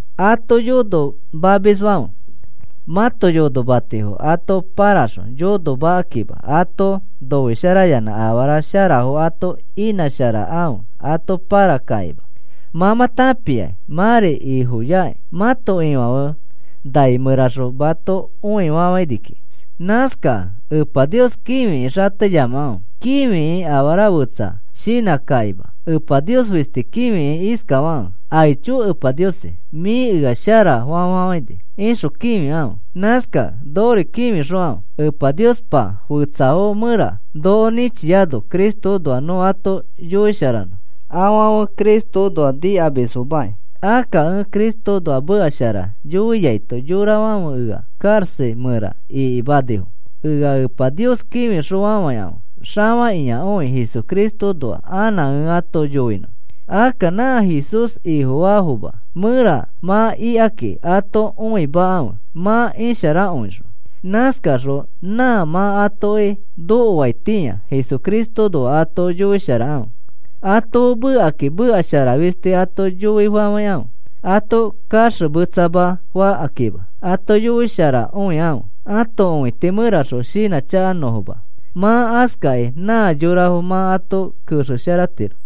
Ato yonomamisfãfe, mãto yonomatifo ato paraxõ yonokakĩma ato noisharayanã afara sharafo ato inãsharakãfe ato parakakĩma. Mã mã tãpiakĩ mãri Ifoyakĩ, mãto Ifãfe nai mẽraxõ mato õifafaini kiki. Nãskakẽ Epa Nios kĩfiki xateyamakãfe, kĩfikĩ afara fetsa shinãkakĩma, Epa Nios fisti kĩfikĩ iskafakãfe: “Aicho Epa Niosi, mĩ ea sharafa fafafãini,” ixõ kĩfikãfe. Nãskakẽ nokori kĩfixokãfe, Epa Niospa fetsafo mẽra noko nĩchiano Cristoõnoa nõ ato yoisharanõ. Afãfe Cristoõnoa nikamisfomaki. Akka ẽ Cristoõnoa meka shara yoiaito yorafãfe ea karaxa mẽra ikimanifo. Ea Epa Nios kĩfixõfafãikãfe xafakĩakõi Jesucristoõnoa anã ẽ ato yoinõ. Akka nã Jesús Ifofaafoma mẽra mã ikaki ato õimakãfe mã isharakõixõ. Nãskaxõ nã mã atoki nokoaitĩa Jesucristoõnoa ato yoisharakãfe. ato fe mekakĩ meka shara fisti ato yoifafãikãfe, ato kaxemetsama fakakĩma ato yoisharakõikãfe, ãto õiti mẽraxõ shinãchakanõfoma. Mã askakĩ nã yorafo mã ato kexesharatiro.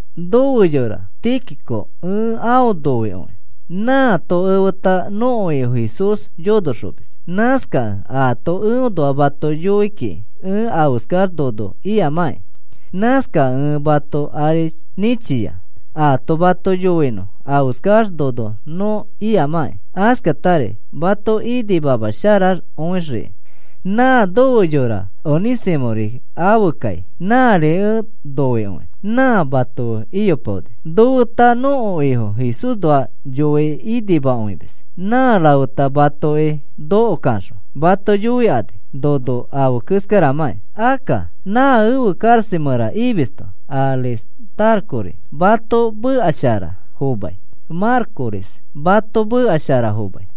Nofe yora Tíquico, ẽ aõ noikõi. Nãato efeta nõko Ifo Jesús yonoxomis. Nãskakẽ aato eõnoa mato yoi kiki ẽ afeskax nono ikamãkĩ. Nãskakẽ ẽ mato ari nĩchia, aato mato yoinõ afeskax nono nõ ikamãkĩ, askatari mato inimamasharakõixiki. Nã nofe yora Onĩsimõri afe kai, nãri ẽ noikõi. Nã mato fe iyopaoni, nofeta nõko Ifo Jesúsnoa yoi inimakõimis. Nã rafeta matoki noko kaxõ mato yoikani nono afe keskaramãki. Akka na efe karaxa mẽra imisto Aristarcori mato meka shara fomai. Marcosri mato meka shara fomai,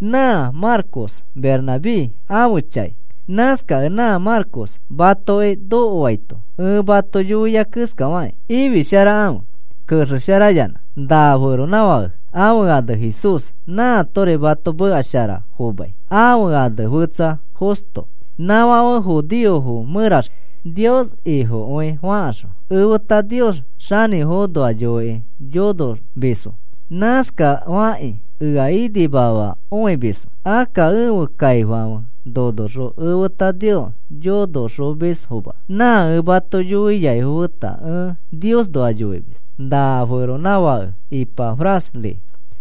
nã Marcos Bernabé ãfe chai. Nãskakẽ nã Marcos matoki nokoaito ẽ mato yoia keskafakĩ ifisharakãfe kexesharayanã. Na feronãfake ãfe ane Jesús nãatori mato meka shara fomai, ãfe ane fetsa Justo. Nãfãfe judeofo mẽraxõ Nios Ifokõi fakaxõ efeta Nios xanĩfoõnoa yoikĩ yonomisfo. Nãskafakakĩ ea inimamakõimisfo. Akka ẽfe kaifãfe nonoxõ efeta Nios yonoxomisfoma, nã ẽ mato yoiaifo feta ẽ Niosnoa yoimis. Na feronãfake Ipafrasri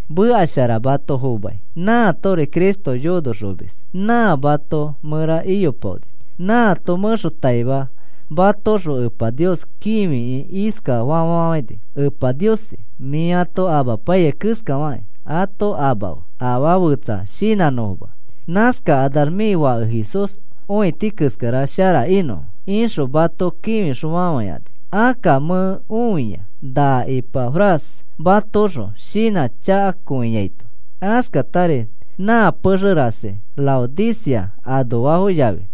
meka shara mato fomai, nãatori Cristo yonoxomis, nã mato mẽra iyopaoni. Nãato mẽxotaima matoõxõ Epa Nios kĩfikĩ iskafa fafafãini: “Epa Niosi, mĩ ato amapaiyai keskafakĩ ato amafe afaa fetsa shinãnõfoma. Nãskakanax mĩ Fake Jesús õiti keskara shara inõfo,” ixõ mato kĩfixõfafãini. Akka mẽ õia na Ipafras matoõxõ shinãchakakõiaito. Askatari nã pexe rasi Laodicea anoafo yafi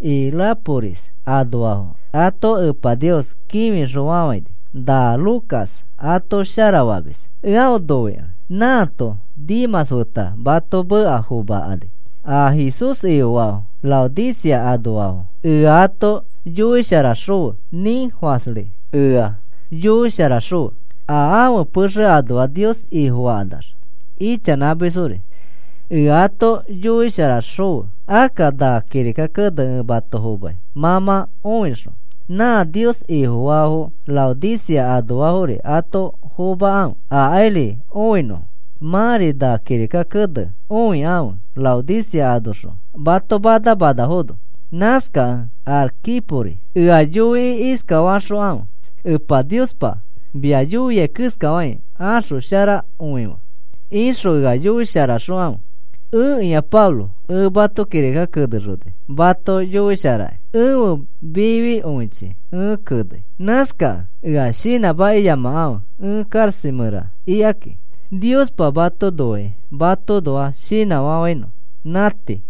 Hierápolis anoafo ato Epa Nios kĩfixõfafãini. Na Lucas ato sharafamis, ẽ aõ noikõi. Nãato Demãs feta mato meka fomakani. A Jesús Ifofaafo Laodicea anoafo ea ato yoisharaxõfe. Nĩnfasri ea yoisharaxõfe, a ãfe pexe anoax Nios Ifofakanax ichanãmisfori ea ato yoisharaxõfe. Akka na kirika kene ẽ mato fomai mã mã õixõ, nã Nios Ifofaafo Laodicea anoafori ato fomakãfe akairi õinõfo. Mãri na kirika kene õikãfe Laodicea anoxõ mato mana manafono. Nãskakẽ Arquipori ea yoikĩ iskafaxokãfe: “Epa Niospa mia yoia keskafakĩ axosharakõife,” ixõ ea yoisharaxokãfe. Ẽkĩa Pablo, ẽ mato kirika kenexoni. Mato yoisharakĩ, ẽfe mifikõichi ẽ kenei. Nãskakẽ ea shinãmakiyamakãfe ẽ karaxa mẽraxõ ikakĩ. Niospa mato noikĩ matoõnoa shinãfafãinõ. Nã tii.